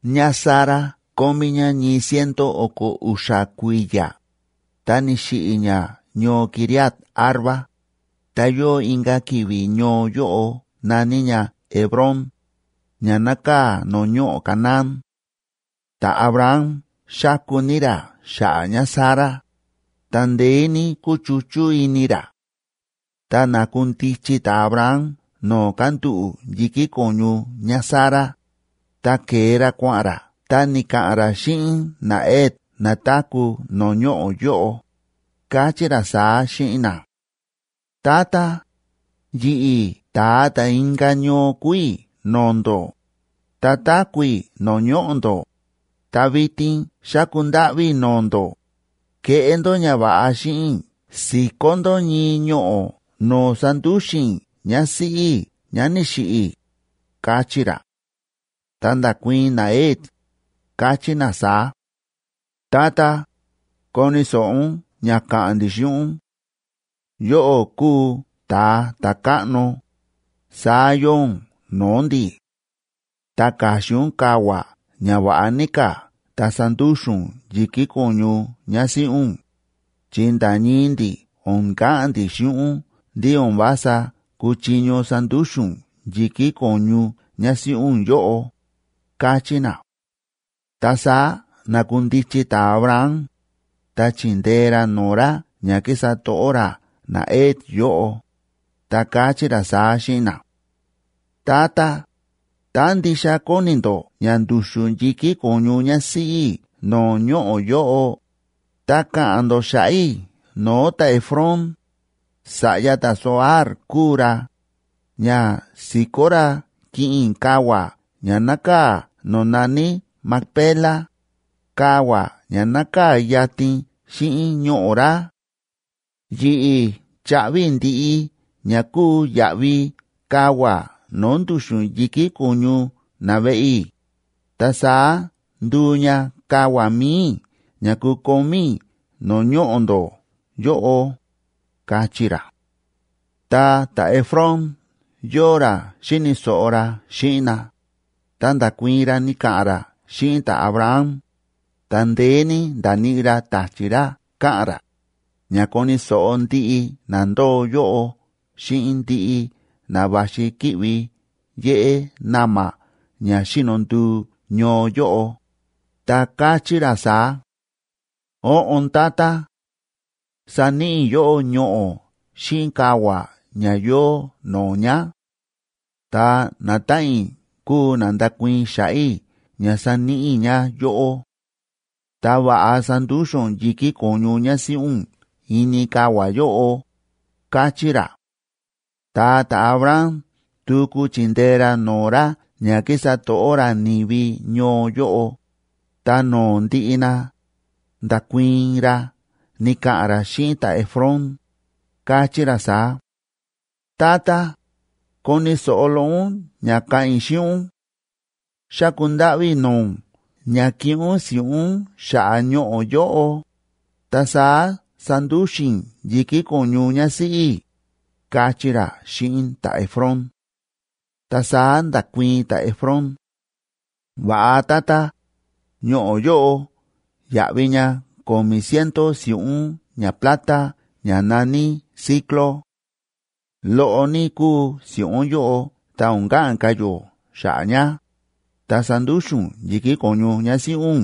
ÑáSara kómí ñá ñii ciento o̱ko̱ u̱xa̱ kui̱ya̱, ta ni̱xiꞌi̱ ñá ñoo Quiriat‑arba, ta yóo inka̱ ki̱vi̱ ñoo yóꞌo na̱ní ña Hebrón, ña nákaa̱ no̱o̱ ñoꞌo̱ Canaán. Ta̱Abraham xáku ní ra xa̱ꞌa̱ ñáSara, ta ndeé ní kúchuchú ini ra. Ta na̱kundichi ta̱Abraham no̱o̱ kándúꞌu̱ yi̱kí ko̱ñu ñáSara, ta ke̱e ra kua̱ꞌa̱n ra ta ni̱ka̱ꞌa̱n ra xíꞌin naHet na táku̱ no̱o̱ ñoꞌo̱ yóꞌo, káchí ra saá xíꞌin na: ―Tata, yi̱ꞌi̱ ta̱a ta̱ inka̱ ñoo kúu i̱ no̱o̱ ndó, ta táku̱ i̱ no̱o̱ ñoꞌo̱ ndó, ta vitin xáku ndáꞌví i̱ no̱o̱ ndó, keꞌé ndó ñava̱ꞌa xíꞌin i̱ si̱kó ndó ñii ñoꞌo̱ no̱o̱ sandúxu̱n i̱ ñásíꞌí i̱ ñá ni̱xiꞌi̱ ―káchí ra. Ta nda̱kuii̱n naHet, káchí na saá: ―Tata, koni̱ so̱ꞌo ún ña ka̱ꞌa̱n ndi̱ xíꞌin ún. Yóꞌó kúu ta̱a ta̱káꞌno, saá yóo ún no̱o̱ ndi̱. Ta ka̱xin ún kavua̱ ña va̱ꞌa ní ka̱ ta sandúxu̱n ún yi̱kí ko̱ñu ñásíꞌí ún, chi nda̱ ñii ndi̱ o̱n ka̱ꞌa̱n ndi̱ xíꞌin ún ndí o̱n vása kúchiño sandúxu̱n ún yi̱kí ko̱ñu ñásíꞌí ún yóꞌo ―káchí na. Ta saá na̱kundichi ta̱Abraham, ta chi̱ndee ra no̱o̱ ra ña kísa to̱ꞌó ra naHet yóꞌo, ta káchí ra saá xíꞌin na: ―Tata, tá ndixa kóni ndó ña ndu̱xu̱n yi̱kí ko̱ñu ñásíꞌí i̱ no̱o̱ ñoꞌo̱ yóꞌo, ta ka̱ꞌa̱n ndó xa̱ꞌa̱ i̱ no̱o̱ ta̱Efrón, sa̱ꞌya ta̱Zohar kúu ra, ña si̱kó ra kiꞌin i̱ kavua̱ ña nákaa̱ no̱o̱ na̱ní Macpela, kavua̱ ña nákaa̱ yatin xíꞌin ñoꞌo̱ ra. Yi̱ꞌi̱ chaꞌvi i̱ ndiꞌi ña kúu yaꞌvi kavua̱ no̱o̱ ndu̱xu̱n yi̱kí ko̱ñu naveꞌe i̱, ta saá nduu ña kavua̱ mi̱i i̱ ña kukomí i̱ no̱o̱ ñoꞌo̱ ndó yóꞌo ―káchí ra. Ta ta̱Efrón yóo ra xíni̱ so̱ꞌo ra xíꞌin na, ta nda̱kuii̱n ra ni̱ka̱ꞌa̱n ra xíꞌin ta̱Abraham, ta ndeé ní nda̱níꞌi ra ta̱chi̱ ra ka̱ꞌa̱n ra, ña koni̱ so̱ꞌo ndiꞌi na ndóo yóꞌo xíꞌin ndiꞌi na va̱xi ki̱ꞌvi yéꞌé na̱ma̱ ña xíno nduu ñoo yóꞌo, ta káchí ra saá: ―Óꞌon, tata. Saníꞌi i̱ yóꞌó ñoꞌo̱ xíꞌin kavua̱ ña yóo no̱o̱ ña. Ta natáꞌan i̱ kúu na ndakuii̱n xa̱ꞌa̱ i̱ ña saníꞌi i̱ ña yóꞌó. Ta va̱ꞌa sandúxu̱n ún yi̱kí ko̱ñu ñásíꞌí ún ini kavua̱ yóꞌo ―káchí ra. Ta ta̱Abraham tuku chi̱ndee ra no̱o̱ ra ña kísa to̱ꞌó ra ni̱vi ñoo yóꞌo, ta no̱o̱ ndiꞌi na, nda̱kuii̱n ra ni̱ka̱ꞌa̱n ra xíꞌin ta̱Efrón, káchí ra saá: ―Tata, koni̱ so̱ꞌo loꞌo ún ña ka̱ꞌa̱n i̱ xíꞌin ún. Xáku ndáꞌví i̱ no̱o̱ ún ña kiꞌin ún si̱ꞌún xa̱ꞌa̱ ñoꞌo̱ yóꞌo, ta saá sandúxu̱n i̱ yi̱kí ko̱ñu ñásíꞌí i̱ ―káchí ra xíꞌin ta̱Efrón. Ta saá nda̱kuii̱n ta̱Efrón: ―Va̱ꞌa tata, ñoꞌo̱ yóꞌo yáꞌvi ña ko̱mi̱ ciento si̱ꞌún ñaplata ña na̱ní siclo. Loꞌo ní kúu si̱ꞌún yóꞌo ta o̱n ka̱ꞌa̱n ka̱ yó xa̱ꞌa̱ ña, ta sandúxu̱n ún yi̱kí ko̱ñu ñásíꞌí ún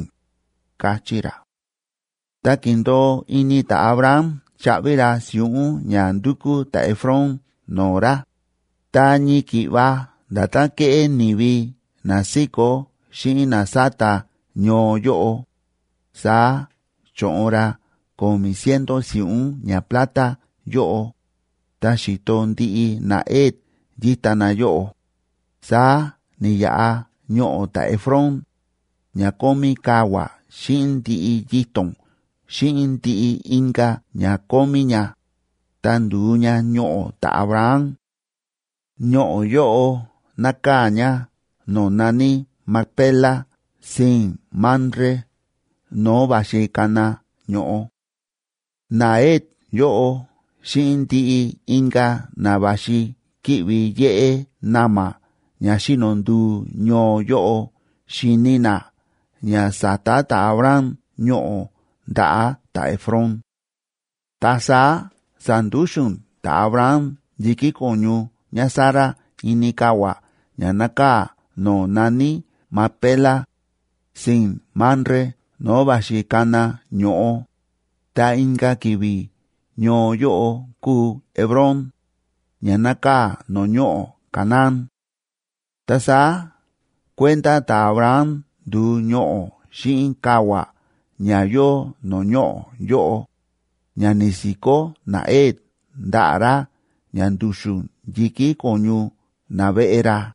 ―káchí ra. Ta ki̱ndo̱o ini ta̱Abraham chaꞌvi ra si̱ꞌún ña ndu̱kú ta̱Efrón no̱o̱ ra, ta ñii ki̱ꞌva nda̱tán kéꞌé ni̱vi na síkó xíꞌin na sáta ñoo yóꞌo, saá cho̱ꞌon ra ko̱mi̱ ciento si̱ꞌún ñaplata yóꞌo, ta xi̱to ndiꞌi naHet yíta na yóꞌo. Saá ni̱yaꞌa ñoꞌo̱ ta̱Efrón, ña kómí kavua̱ xíꞌin ndiꞌi yito̱n xíꞌin ndiꞌi inka̱ ña kómí ña, ta ndu̱u ña ñoꞌo̱ ta̱Abraham; ñoꞌo̱ yóꞌo nákaa̱ ña no̱o̱ na̱ní Macpela sii̱n Mamre no̱o̱ va̱xi kana ño̱ꞌo. NaHet yóꞌo xíꞌin ndiꞌi inka̱ na va̱xi ki̱ꞌvi yéꞌé na̱ma̱ ña xíno nduu ñoo yóꞌo xi̱ni na ña sa̱ta ta̱Abraham ñoꞌo̱ ndaꞌa̱ ta̱Efrón. Ta saá sa̱ndúxu̱n ta̱Abraham yi̱kí ko̱ñu ñáSara ini kavua̱ ña nákaa̱ no̱o̱ na̱ní Macpela, sii̱n Mamre no̱o̱ va̱xi kana ño̱ꞌo, ta inka̱ ki̱vi̱ ñoo yóꞌo kúu Hebrón, ña nákaa̱ no̱o̱ ñoꞌo̱ Canaán. Ta saá kuenda ta̱Abraham ndu̱u ñoꞌo̱ xíꞌin kavua̱ ña yóo no̱o̱ ñoꞌo̱ yóꞌo, ña ni̱si̱kó naHet ndaꞌa̱ ra ña ndu̱xu̱n yi̱kí ko̱ñu naveꞌe ra.